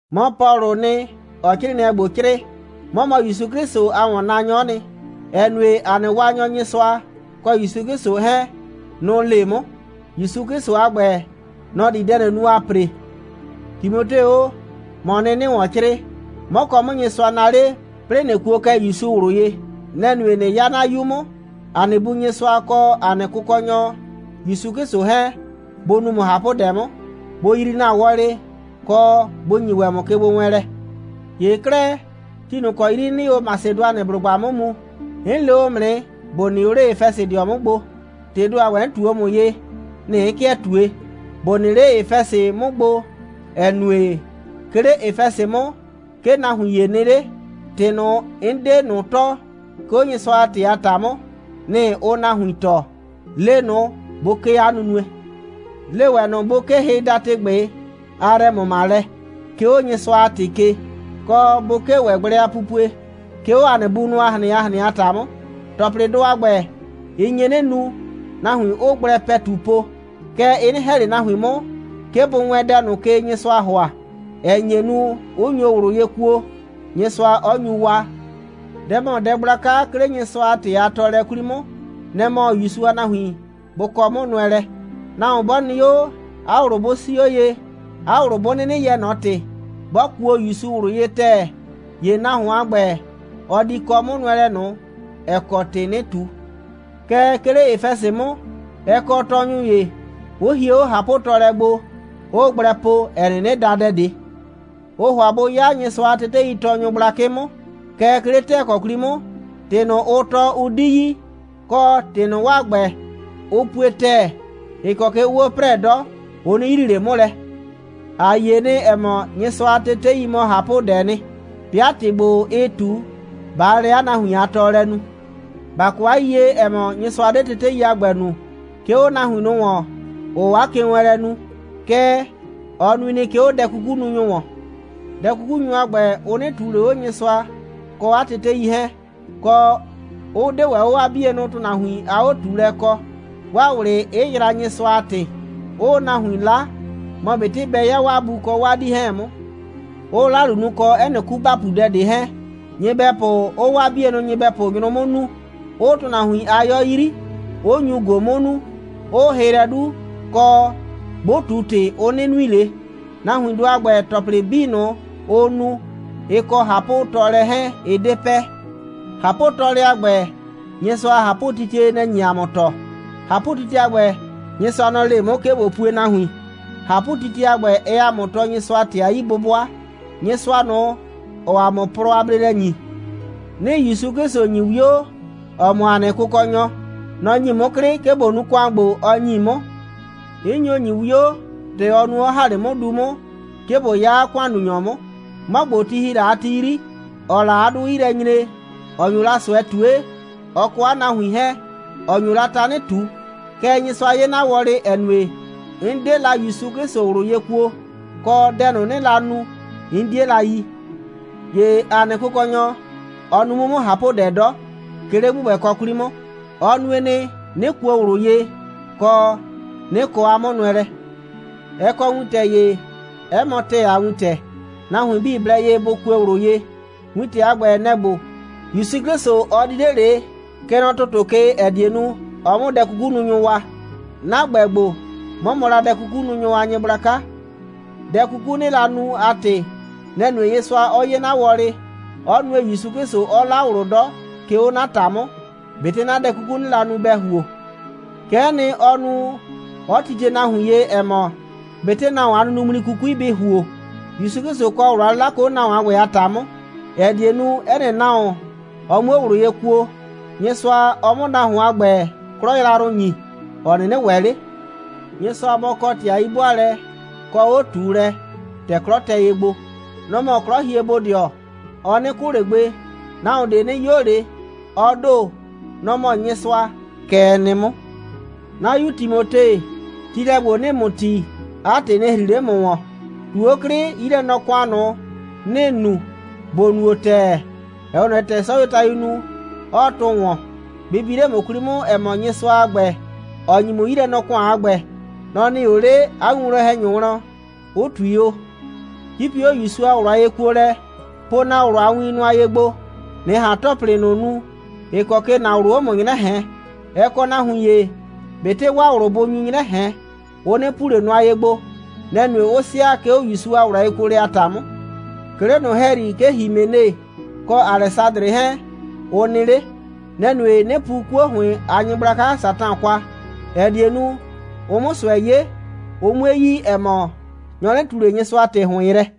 'Mɔ Pɔlʋʋ nɩ, ‑ɔɔ 'crɩɩnɩɛ ‑gbo 'crɩɩ. 'Mɔ mɔ ‑Yusu 'Klɩsʋ a ‑wɔnnaanyɔ'ɔ nɩ, ‑ɛ nue, ‑a nɩ Waanyɔ Nyɩsʋa kɔ ‑Yusu 'Klɩsʋ 'hɛɛn, nʋ‑ le 'mʋ. ‑Yusu 'Klɩsʋ a ‑gbɛ, nɔ‑ di dɛ ꞊nʋ nu, ‑aa ‑pre. Timote o, ‑mɔɔ nɩ, 'nɩɩ ‑wɔn 'crɩɩ. 'Mɔ kɔ 'mʋ Nyɩsʋa naa 'le, 'plɩɩ ꞊nɩ kuo kɛ ‑Yusu ꞊wlʋ ye. Nɛ‑ nue, ꞊nɩ 'ya 'na 'yu 'mʋ. ‑A nɩ Bu Nyɩsʋa kɔ ‑a nɩ Kʋkɔnyɔ ‑Yusu 'Klɩsʋ 'hɛɛn, bʋ nu ‑mʋ ꞊hapʋdɛ 'mʋ, bʋ yrii ‑na wɔlɩ, kɔ, bʋ ‑nyi ‑wɛ ‑mʋ kegbowɛɛnlɛ. ‑Ye 'klɛɛ, ti ꞊nʋ ‑kɔ 'yri 'nɩɩ o Masedʋanɩblʋgba 'mʋ mu, 'n le o ‑mʋ nɩ, ‑bo nɩ o 'le Efɛsɩdɩɔ 'mʋ gbo. ‑Tɩɩ ‑do a ‑gbɛ, 'n ꞊tu o ‑mʋ ye, nɩ‑ 'n 'kɩɛ ꞊tue: ‑bo nɩ 'le Efɛsɩ 'mʋ gbo, ‑ɛ nue, 'ke 'le Efɛsɩ 'mʋ, 'ke nahuin ‑ye nɩ 'le, ‑tɩ ꞊nʋ, 'n 'de ꞊nʋ tɔɔ, 'ke 'o Nyɩsʋa a ‑tɩ a ‑ta 'mʋ, nɩ‑ ʋʋ nahuin tɔɔ. Le ꞊nʋ, bʋ 'kee 'a nunue. Le ‑wɛ ꞊nʋ, bʋ 'kee hɩdatɩgbɩ a yrɛ‑mʋmalɛ, 'ke 'o Nyɩsʋa a ‑tɩ ke, kɔ, bʋ 'kee ‑wɛ gblɛ a pupue, 'ke 'o ‑a nɩ bunʋ a ꞊hrɩn a ꞊hrɩn a ‑ta 'mʋ. ‑Tɔplɩdʋ a ‑gbɛ, ɩ nye 'nɩ nu, nahuin 'ʋʋ gblɛ ‑pɛtu po, kɛɛ, ɩ 'nɩ ‑hɛ ꞊le nahuin 'mʋ, 'ke bʋ wɛɛn dɛ ꞊nʋ ke, Nyɩsʋaa ‑hʋa, ‑ɛ nye nu, 'ʋ nyo ꞊wlʋ ye kuo, Nyɩsʋa 'ɔ nyu waa. Dɛ ‑mɔ dɛ gblaka, 'ke 'le Nyɩsʋa a ‑tɩ a tɔɔlɛ 'kwli 'mʋ, nɛ‑ mɔ ‑Yusu a nahuin bʋ kɔ 'mʋnʋɛlɛ. Nahuon 'bɔ nɩ 'o, 'a ꞊wlʋ 'bʋ 'sii 'o ye, 'a ꞊wlʋ 'bʋ 'nɩnɩ yɛɛ ꞊nɔ ‑tɩ, 'bɔ kuo ‑Yusu ꞊wlʋ ye ‑tɛɛ, ‑ye nahuon a ‑gbɛ, ɔ di kɔ 'mʋnʋɛlɛ ꞊nʋ, ‑ɛ kɔ ‑tɩ 'nɩɩ ꞊tu. Kɛɛ, 'ke 'le Efɛsɩ 'mʋ, ɛ kɔ tɔɔnyʋ ‑ye, 'ʋ hie 'o ꞊hapʋtɔɔlɛ gbo, 'ʋʋ gblɛ po, ‑ɛ 'nɩnɩ da dɛ ꞊de. Ʋʋ ‑hʋa bʋ 'ya Nyɩsʋa a teteitɔɔnyʋ gblakɩ 'mʋ, kɛɛ, 'ke 'le ‑tɛɛkɔ 'kwli 'mʋ, ‑tɩ ꞊nʋ, ʋʋ tɔɔ, ʋ 'di yi, kɔ, ‑tɩ ꞊nʋ, 'waa ‑gbɛ, ʋ pue ‑tɛɛ, ‑ɩ kɔ ke ʋʋ 'o 'prɛɛ 'dɔ, ʋ 'nɩ yrii ꞊le 'mʋ lɛ. ‑A yie nɩ, ‑ɛ mɔ, Nyɩsʋa a tetei mɔ ꞊hapʋdɛɛ nɩ, 'bɩa ‑tɩ ‑gbo, ɩɩ ꞊tu, ꞊baa lɛ 'a nahuin a tɔɔlɛ nu. ‑Ba kɔ 'a yiyie, ‑ɛ mɔ, Nyɩsʋa 'de tetei a ‑gbɛ nu, 'ke 'o nahuin ꞊nʋ ‑wɔn, ‑ʋʋ 'a kewɛɛnlɛ nu, kɛɛ, ɔ nui nɩ, 'ke 'o dɛ'kukununyʋ ‑wɔn. Dɛ'kukununyʋ a ‑gbɛ, ʋ 'nɩ ꞊tuu ꞊le 'o Nyɩsʋa kɔ 'a tetei 'hɛɛn, kɔ, 'ʋ 'de ‑wɛ 'o 'waa 'bienʋ ‑tʋnahuin a 'o꞊tuulɛ kɔ, 'waa ꞊wlɩ 'ɩ yraa Nyɩsʋa a ‑tɩ, 'ʋʋ nahuin 'la, mɔ ꞊betɩ bɛ 'ya 'waa bu kɔ 'waa 'dii 'hɛɛn 'mʋ, 'ʋʋ 'lalu nu, kɔ 'ɛ nɩ 'kubapudɛ ꞊de 'hɛɛn, nyɩbɛpʋ 'ʋʋ 'waa 'bie nyɩbɛpʋ nyrʋ 'mʋ nuu, 'ʋʋ ‑tʋnahuin a 'yɔ 'yri, 'ʋ nyu ꞊go 'mʋ nuu, 'ʋʋ hɩ lɛ 'du, kɔ, 'bʋ ꞊tu ‑tɩ, ʋ 'nɩ nui ꞊le. Nahuindʋ a ‑gbɛ, ‑tɔplɩ 'bii ꞊nʋ, ʋʋ nu, ɩ kɔ ꞊hapʋtɔɔlɛ 'hɛɛn, ɩ 'de pɛ. ꞊Hapʋtɔɔlɛ a ‑gbɛ, Nyɩsʋa a ꞊hapʋtitie, nɛ‑ nye ‑a mʋ tɔɔ. ꞊Hapʋtitie a ‑gbɛ, Nyɩsʋa, nɔ‑ le 'mʋ, 'ke ꞊bo pue nahuin. ꞊Hapʋtitie a ‑gbɛ, ɛɛ ‑a mʋ tɔɔ Nyɩsʋa a ‑tɩ a 'yi'bʋbʋa, Nyɩsʋa ꞊nʋ, ‑ɔɔ ‑a mʋ plɔ a bleelɛ ‑nyi. 'Nɩɩ ‑Yusu 'Klɩsʋ ‑nyi 'wio, ‑ɔ mɔ ‑a nɩ Kʋkɔnyɔ. Nɔ‑ ‑nyi 'mʋ 'klɩ, 'ke ꞊bo nu ‑kʋan ‑gbo, ɔ ‑nyi 'mʋ. 'N nyo ‑nyi 'wio, ‑tɛ ɔ nu, 'ɔ ‑ha 'le 'mʋ du 'mʋ, 'ke ꞊bo 'ya 'a ‑kʋannunyɔ 'mʋ, 'mɔ ‑gbo, ti ‑hi la a ti 'yri, ‑ɔɔ la 'a 'dʋ 'yi lɛ nyre, ‑ɔ nyo la ꞊sʋɛ ꞊tue, ɔ kɔ 'a nahuin 'hɛɛn, ‑ɔ nyo la tanɩ ꞊tu. Kɛɛ, Nyɩsʋa 'ye 'na wɔlɩ, ‑ɛ nue, 'n 'de la ‑Yusu 'Klɩsʋ ꞊wlʋ ye kuo, kɔ, dɛ ꞊nʋ, 'nɩɩ la nu, 'n 'die la yi. ‑Ye ‑a nɩ Kʋkɔnyɔ, ɔ nu 'mʋ 'mʋ ꞊hapʋdɛ 'dɔ, 'ke 'le ‑gbʋgbɛkɔ 'kwli 'mʋ. Ɔ nue nɩ, 'nɩ kuo ꞊wlʋ ye, kɔ, 'nɩ kɔ 'a 'mʋnʋɛlɛ. Ɛ kɔ wintɛ ‑ye, 'ɛ mɔ ‑tɛɛ a wintɛ. Nahuin 'bii blɛ ye bʋ kue ꞊wlʋ ye. Wintɛ a ‑gbɛ, nɛ‑ ‑gbo: ‑Yusu 'Klɩsʋ, ɔ di 'le ꞊le, kɛ nɔ ‑tʋtʋ ke, ‑ɛ die nu, ɔ 'mʋ dɛ'kukununyʋ waa. 'Na ‑gbɛ ‑gbo, 'mɔ mɔ la dɛ'kukununyʋ a nyɩgblaka. Dɛ 'kuku, 'nɩɩ la nu a ‑tɩ, nɛ‑ nue, Nyɩsʋa 'ɔ 'ye 'na wɔlɩ, 'ɔ nue, ‑Yusu 'Klɩsʋ 'ɔ 'la ꞊wlʋ 'dɔ, 'ke 'o 'na ‑ta 'mʋ, ꞊betɩ 'na dɛ 'kuku, 'nɩɩ la nu, bɛ ‑huo. Kɛ'ɛ nɩ, ɔ nu, 'ɔ titie nahuin ye, ‑ɛ mɔ, ꞊betɩ nahuon a nunuŋmli 'kukui bɩ ‑huo, ‑Yusu 'Klɩsʋ kɔ ꞊wlʋ a 'lɩla, 'ke 'o nahuon a ‑gbɛ a ‑ta 'mʋ, ‑ɛ die nu, 'ɛ nɩ nahuon, ɔ 'muo ꞊wlʋ ye kuo, Nyɩsʋa, ɔ 'mʋ nahuon a ‑gbɛ 'klɔ yrayrʋ ‑nyi, ‑ɔ 'nɩnɩ ‑wɛ 'le. Nyɩsʋa bɔ kɔ ‑tɩ a 'yi'bʋaalɛ kɔ 'o꞊tuulɛ, ‑tɛ 'klɔ tɛ ye gbo. Nɔ‑ mɔ 'klɔhiebodɩɔ. Ɔ 'nɩ 'kʋ ꞊le gbe. Nahuon ꞊de 'nɩ 'yo ꞊le. Ɔ ‑do, nɔ‑ mɔ Nyɩsʋa. Kɛ ɛ nɩ 'mʋ. 'Na 'yu Timote, tiilɛ ‑gbo, 'nɩɩ ‑mʋ tii, 'a ‑tɩ nɩ ‑hri 'le ‑mʋ ‑wɔn: ꞊Tu 'o 'klɩ, 'yilɛnɔ‑kʋan ꞊nʋ, ‑nɩɩ nu, ‑bo nuo ‑tɛɛ, ‑ɛ 'we ꞊nɔ ye, ‑tɛ 'sɔyuotayuu nu, 'ɔɔ tʋ ‑wɔn. Bɩ bi 'le ‑mʋ 'kwli 'mʋ, ‑ɛ mɔ, Nyɩsʋa a ‑gbɛɛ nɩ, ‑ɔ ‑nyi ‑mʋ 'yilɛnɔ‑kʋan a ‑gbɛ. Nɔ‑ nɩɩ o 'le 'a winwlɔn‑hɛnyʋ wlɔn, 'ʋ ꞊tui o. 'Cipi 'o ‑Yusu a ꞊wlʋ a yekuolɛ. Po ‑na ꞊wlʋ a win nʋa ye gbo, ꞊nɩ ꞊han ‑tɔplɩ ꞊nʋ nu, ‑ɩ kɔ ke ‑na ꞊wlʋ, ʋʋ 'o ‑mʋ 'nyrɛ ꞊hɛɛn. Ɛ kɔ nahuin ‑ye, ꞊betɩ 'waa ꞊wlʋ bʋʋ ꞊nʋ 'nyrɛ ꞊hɛn, ʋ 'nɩ pu ꞊le nʋa ye gbo. Nɛ‑ nue, 'ʋ sɩa, 'ke 'o ‑Yusu a ꞊wlʋ a yekuolɛ a ‑ta 'mʋ. 'Ke 'le ꞊nʋ ‑hɛyri, 'ke Himene kɔ Alɛsadrɩ 'hɛɛn, ʋ nɩ 'le. Nɛ‑ nue, 'nɩ pu 'kuo ‑hʋɩn a nyɩgblaka Satan kwa, ‑ɛ die nu, ʋ 'mʋ ꞊sʋɛ 'ye, ʋ 'mue yi, ‑ɛ mɔ, nyɔ 'nɩ ꞊tu ꞊le Nyɩsʋa ‑tɩ ‑hʋɩn yrɛ.